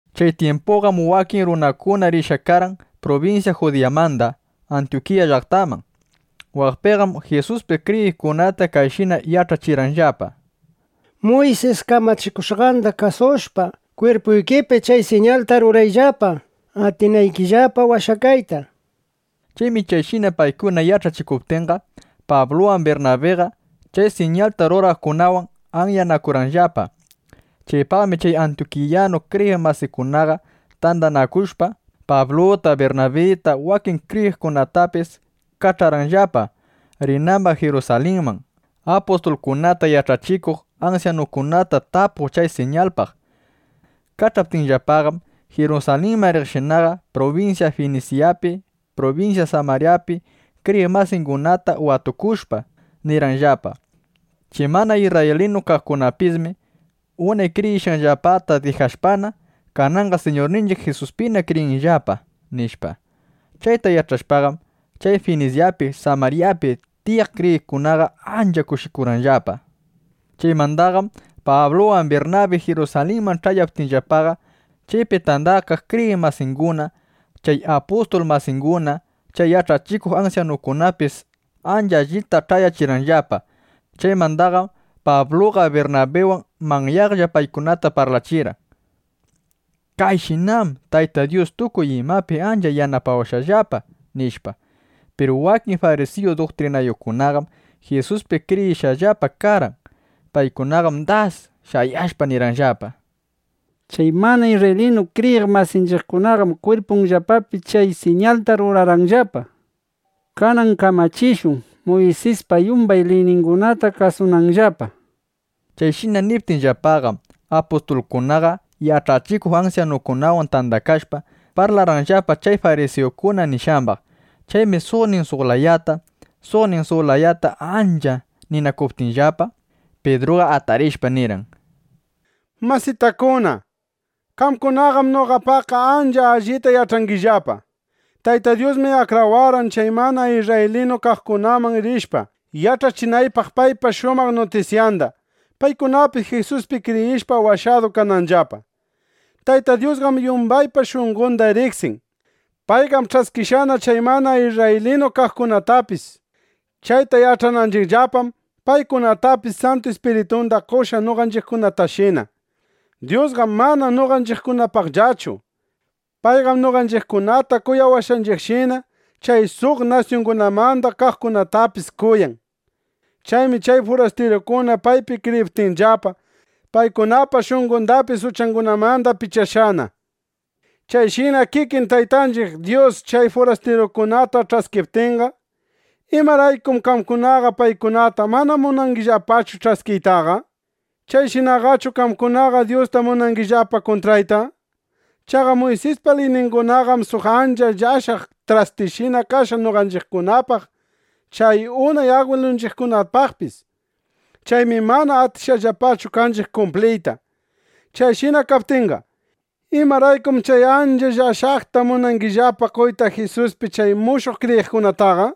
Chay tyimpuqam wakin runakuna rishqa karqan prubinsya Judiyamanda Antyukiya llaqtaman. Waqpiqam Jisuspi kriyiqkunata kayshina yach'achirqanllapa: —Muysis kamachikushqanda kasushpa, kwirpuykipi chay siñalta rurayllapa, atinaykillapa washakayta, nishpa. Chaymi chayshina paykuna yach'achikuptinqa, Pabluwan Birnabiqa chay siñalta ruraqkunawan anyanakurqanllapa. Chaypaqmi chay Antyukiyanu kriyiq masikunaqa tandanakushpa, Pabluta, Birnabita, wakin kriyiqkunatapis kach'arqanllapa, rinambaq Jirusalinman, apustulkunata, yach'achikuq ansyanukunata tapuq chay siñalpaq. Kach'aptinllapaqam, Jirusalinman riqshinaqa, prubinsya Finisyapi, prubinsya Samaryapi kriyiq masingunata watukushpa, nirqanllapa: —Chay mana isrraylinu kaqkunapismi unay kriyishqanllapata dijashpana, kananqa Siñurninchiq Jisuspina kriyishqallapa, nishpa. Chayta yach'ashpaqam, chay Finisyapi, Samaryapi tiyaq kriyiqkunaqa ancha kushikurqanllapa. Chaymandaqam Pabluwan Birnabi Jirusalinman ch'ayaptinllapaqa, chaypi tandakaq kriyiq masinguna, chay apustul masinguna, chay yach'achikuq ansyanukunapis ancha allita ch'ayachirqanllapa. Chaymandaqam Pabluqa Birnabiwan manyaqlla paykunata parlachirqan: “Kayshinam Tayta Dyus tukuy imapi ancha yanapawashqallapa”, nishpa. Piru wakin farisiyu duktrinayuqkunaqam Jisuspina kriyishqallapa karqan. Paykunaqam das shayashpa, nirqanllapa: —Chay mana isrraylinu kriyiq masinchiqkunaqam kwirpunllapapi chay siñalta ruranqallapa. Kanan kamachishun, Muysispa yumbay liyningunata kasunanllapa, nishpa. Chayshina niptinllapaqam, apustulkunaqa yach'achikuq ansyanukunawan tandakashpa, parlarqanllapa chay farisiyukuna nishqambaq. Chaymi suqnin suq layata, suqnin suq layata ancha ninakuptinllapa, Pidruqa atarishpa nirqan: —Masitakuna, qamkunaqam noqapaqqa ancha allita yach'angillapa: Tayta Dyusmi akrawarqan, chay mana isrraylinu kaqkunaman rishpa, yach'achinaypaq paypa shumaq nutisyanda, paykunapis Jisuspi kriyishpa washadu kananllapa. Tayta Dyusqam yumbaypa shunqonda riqsin. Payqam ch'askishqana chay mana isrraylinu kaqkunatapis. Chayta yach'ananchiqllapam, paykunatapis Santu Ispiritunda qoshqa noqanchiqkunatashina. Dyusqam mana noqanchiqkunapaqllachu. Payqam noqanchiqkunata kuyawashqanchiqshina, chay suq nasyungunamanda kaqkunatapis kuyan. Chaymi chay furastirukuna paypi kriyiptinllapa, paykunapa shunqondapis uchangunamanda pichashqana. Chayshina kikin Taytanchiq Dyus chay furastirukunata ch'askiptinqa, ¿imaraykum qamkunaqa paykunata mana munangillapachu ch'askiytaqa? ¿Chayshinaqachu qamkunaqa Dyusta munangillapa kuntrayta? Chaqa Muysispa liyningunaqam suq ancha llashaq trastishina kashqa noqanchiqkunapaq chay unay agwilunchiqkunapaqpis. Chaymi mana atishqallapachu kanchiq kumpliyta. Chayshina kaptinqa, ¿imaraykum chay ancha llashaqta munangillapa qoyta Jisuspi chay mushuq kriyiqkunataqa?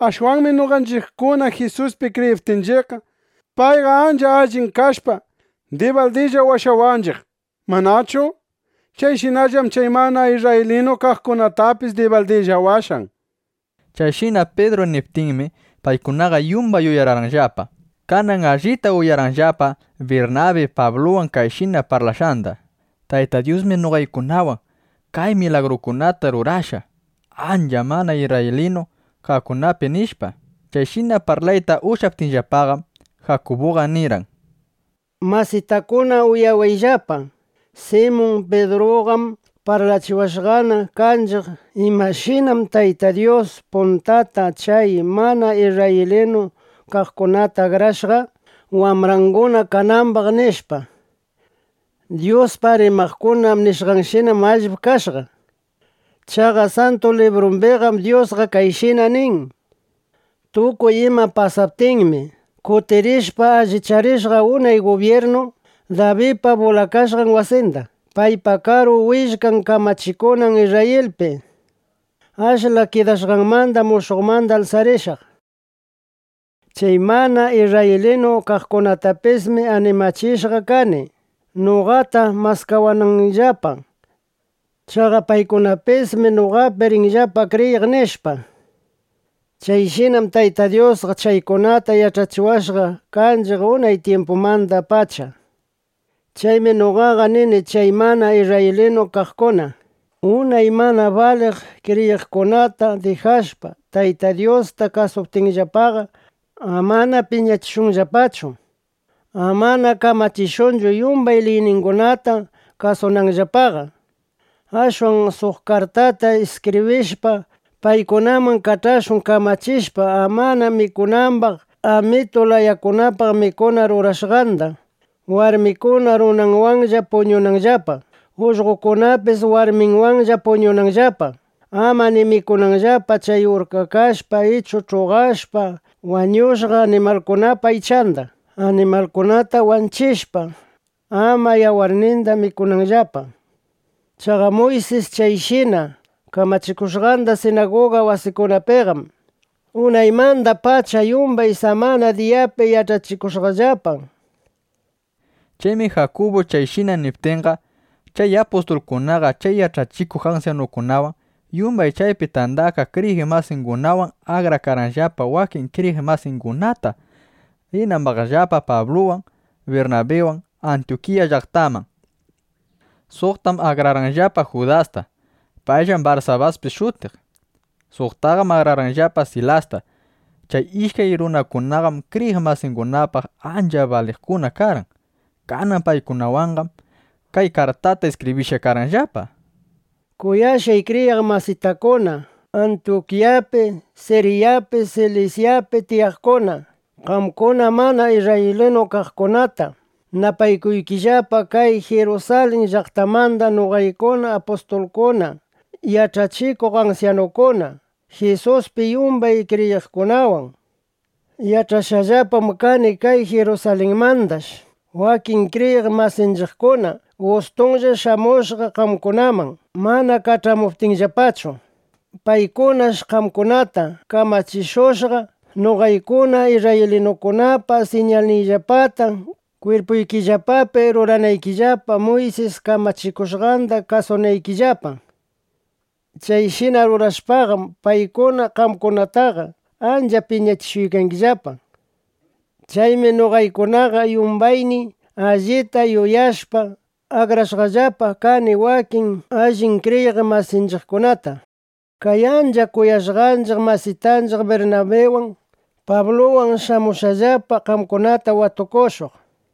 Ashwanmi noqanchiqkuna Jisuspi kriyiptinchiqqa, payqa ancha allin kashpa, dibaldilla washawanchiq, ¿manachu? Chayshinallam chay mana isrraylinu kaqkunatapis dibaldilla washan. Chayshina Pidru niptinmi, paykunaqa yumbay uyararqanllapa. Kanan allita uyarqanllapa Birnabi Pabluwan kayshina parlashqanda: —Tayta Dyusmi noqaykunawan kay milagrukunata rurashqa chay mana isrraylinu kaqkunapi, nishpa. Chayshina parlayta ushyaptinllapaqam, Jakubuqa nirqan: —Masitakuna, uyawayllapa. Simun Pidruqam parlachiwashqana kanchiq imashinam Tayta Dyus puntata chay mana isrraylinu kaqkunata akrashqa, wambranguna kanambaq, nishpa. Dyuspaq rimaqkuna nishqanshinam allip kashqa. Chaqa Santu Librumbiqam Dyusqa kayshina nin: Tukuy ima pasaptinmi, kutirishpa allicharishaq unay gubyirnu Dabidpa bulakashqan wasinda, paypa karu willkan kamachikunan Isrrayilpi. Ashla kidashqanmandam mushuqmanda alsarishaq. Chay mana isrraylinu kaqkunatapismi animachishqa kani, noqata maskawananllapa. Chaqa paykunapismi noqapi rinllapa kriyiq, nishpa. Chayshinam Tayta Dyusqa chaykunata yach'achiwashqa kanchiq unay tyimpumandapacha, nishpa. ’Chaymi noqaqa nini, chay mana isrraylinu kaqkuna, unay mana baliq kriyishqangunata dijashpa, Tayta Dyusta kasuptinllapaqa, amana piñachishunllapachu. Amana kamachishunchu, yumbay liyninchiqkunata kasunanllapaqa. Ashwan suq kartata iskibrishpa, paykunaman kach'ashun, kamachishpa, ama mikunambaq amitu layakunapaq mikuna rurashqanda; warmikuna runanwanlla puñunanllapa, ullqokunapis warminwanlla puñunanllapa, ama ni mikunanllapa chay urkakashpa ichu ch'uqashpa wañushqa animalkunapa aychanda; animalkunata wanchishpa, ama yawarninda mikunanllapa. Chaqa Muysis chayshina kamachikushqanda sinaguga wasikunapiqam unaymandapacha yumbay samana diyapi yach'achikushqallapa. Chaymi Jakubu chayshina niptinqa, chay apustulkunaqa, chay yach'achikuq ansyanukunawan, yumbay chaypi tandakaq kriyiq masingunawan akrarqanllapa wakin kriyiq masingunata, rinambaqllapa Pabluwan, Birnabiwan Antyukiya llaqtaman. Suqtam akrarqanllapa Judasta. Payllam Barsabaspis shutiq. [Nuta: Payqam mana Judas Iskaryutichu karqan.] Suqtaqam akrarqanllapa Silasta. Chay ishkay runakunaqam kriyiq masingunapaq ancha baliqkuna karqan. Kanan paykunawanqam kay kartata iskibrishpa kach'arqanllapa: “Kuyashqay kriyiq masitakuna Antyukiyapi, Siryapi, Silisyapi tiyaqkuna, qamkuna mana isrraylinu kaqkunata napaykuykillapa kay Jirusalin llaqtamanda noqaykuna apustulkuna, yach'achikuq ansyanukuna, Jisuspi yumbay kriyiqkunawan. Yach'ashqallapam kani kay Jirusalinmandash wakin kriyiq masinchiqkuna gustunlla shamushqa qamkunaman, mana kach'amuptiyllapachu. ˻Paykunash qamkunata kamachishushqa, noqaykuna isrraylinukunapa siñalniyllapata kwirpuykillapapi ruranaykillapa, Muysis kamachikushqanda kasunaykillapa.˼ Chayshina rurashpaqam, paykuna qamkunataqa ancha piñachishushqallapa, nishpa. Chaymi noqaykunaqa yumbayniy, allita yuyashpa, akrashqallapa kani wakin allin kriyiq masinchiqkunata, kay ancha kuyashqanchiq masitanchiq Birnabiwan, Pabluwan shamunanllapa qamkunata watukushuq.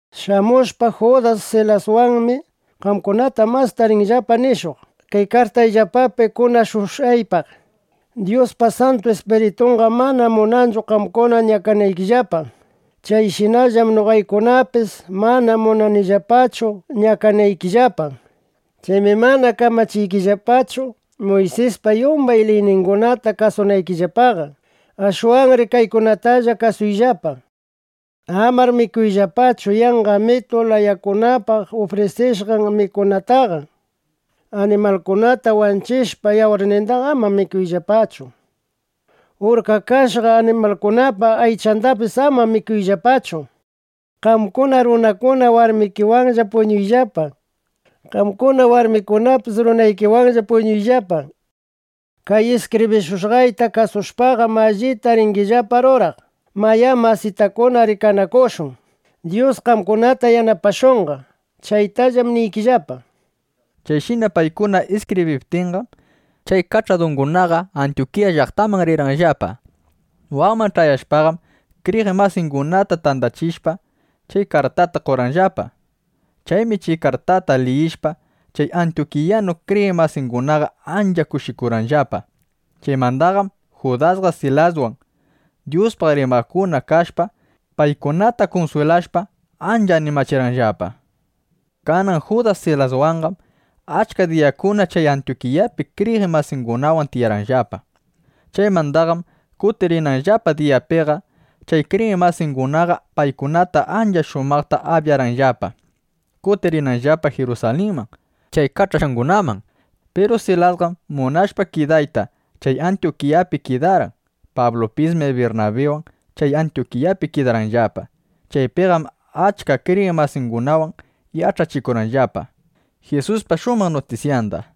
Shamushpa Judas Silaswanmi qamkunata masta rinllapa nishuq kay kartayllapapi kunashushqaypaq. Dyuspa Santu Ispiritunqam mana munanchu qamkuna ñakanaykillapa. Chayshinallam noqaykunapis mana munanillapachu ñakanaykillapa. Chaymi mana kamachiykillapachu, Muysispa yumbay liyningunata kasunaykillapaqa. Ashwanri kaykunatalla kasuyllapa: Amar mikuyllapachu yanqa amitu layakunapaq ufrisishqan mikunataqa. Animalkunata wanchishpa, yawarnindaqa ama mikuyllapachu. Urkakashqa animalkunapa aychandapis ama mikuyllapachu. Qamkuna runakuna, warmikiwanlla puñuyllapa. Qamkuna warmikunapis runaykiwanlla puñuyllapa. Kay iskibrishushqayta kasushpaqam, allita ringillapa ruraq. Mayá masitakuna, rikanakushun. Dyus qamkunata yanapashunqa. Chaytallam niykillapa”, nishpa. Chayshina paykuna iskibriptinqam, chay kach'adungunaqa Antyukiya llaqtaman rirqanllapa. Waqman ch'ayashpaqam, kriyiq masingunata tandachishpa, chay kartata qorqanllapa. Chaymi chay kartata liyishpa, chay antyukiyanu kriyiq masingunaqa ancha kushikurqanllapa. Chaymandaqam Judasqa Silaswan Dyuspaq rimaqkuna kashpa, paykunata kunswilashpa, ancha animachirqanllapa. Kanan Judas Silaswanqam achka diyakunata chay Antyukiyapi kriyiq masingunawan tiyarqanllapa. Chaymandaqam kutirinanllapa diyapiqa chay kriyiq masingunaqa paykunata ancha shumaqta abyarqanllapa, kutirinanllapa Jirusalinman chay kach'ashqangunaman. ˻ Piru Silasqam munashpa kidayta, chay Antyukiyapi kidarqan.˼ Pablupismi Birnabiwan chay Antyukiyapi kidarqanllapa. Chaypiqam achka kriyiq masingunawan yach'achikurqanllapa Jisuspa shumaq nutisyanda.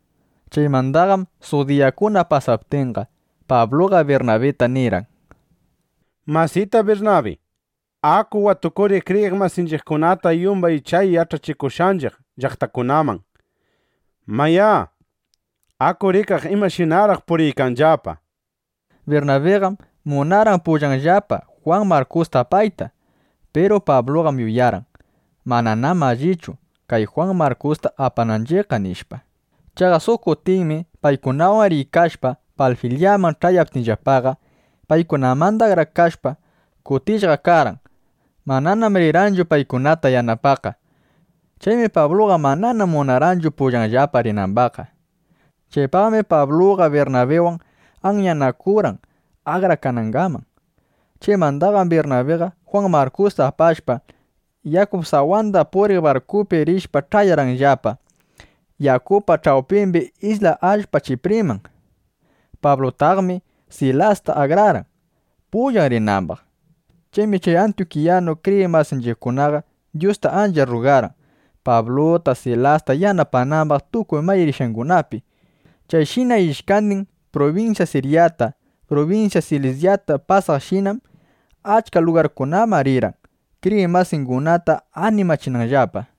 Chaymandaqam suq diyakuna pasaptinqa, Pabluqa Birnabita nirqan: —Masita Birnabi, aku watukuriq kriyiq masinchiqkunata yumbay chay yach'achikushqanchiq llaqtakunaman. Mayá, aku rikaq imashinaraq puriykanllapa, nishpa. Birnabiqam munarqan pullanllapa Jwan Markusta apayta. Piru Pabluqam yuyarqan: Mananam allichu kay Jwan Markusta apananchiqqa, nishpa. Chaqa suq kutinmi paykunawan riykashpa, Panfilyaman ch'ayaptinllapaqa, paykunamanda akrakashpa, kutishqa karqan. Mananam rirqanchu paykunata yanapaqqa. Chaymi Pabluqa manana munarqanchu pullanllapa rinambaqqa. Chaypaqmi Pabluqa Birnabiwan anyanakurqan akrakanangaman. Chaymandaqam Birnabiqa Jwan Markusta apashpa, yakup sawanda puriq barkupi rishpa, ch'ayarqanllapa yakupa ch'awpimbi isla allpa Chipriman. Pablunataqmi Silasta akrarqan, pullan rinambaq. Chaymi chay antyukiyanu kriyiq masinchiqkunaqa Dyusta ancha rrugarqan, Pabluta, Silasta yanapanambaq tukuy may rishqangunapi. Chayshina ishkandin prubinsya Siryata, prubinsya Silisyata pasaqshinam, achka lugarkunaman rirqan, kriyiq masingunata animachinanllapa.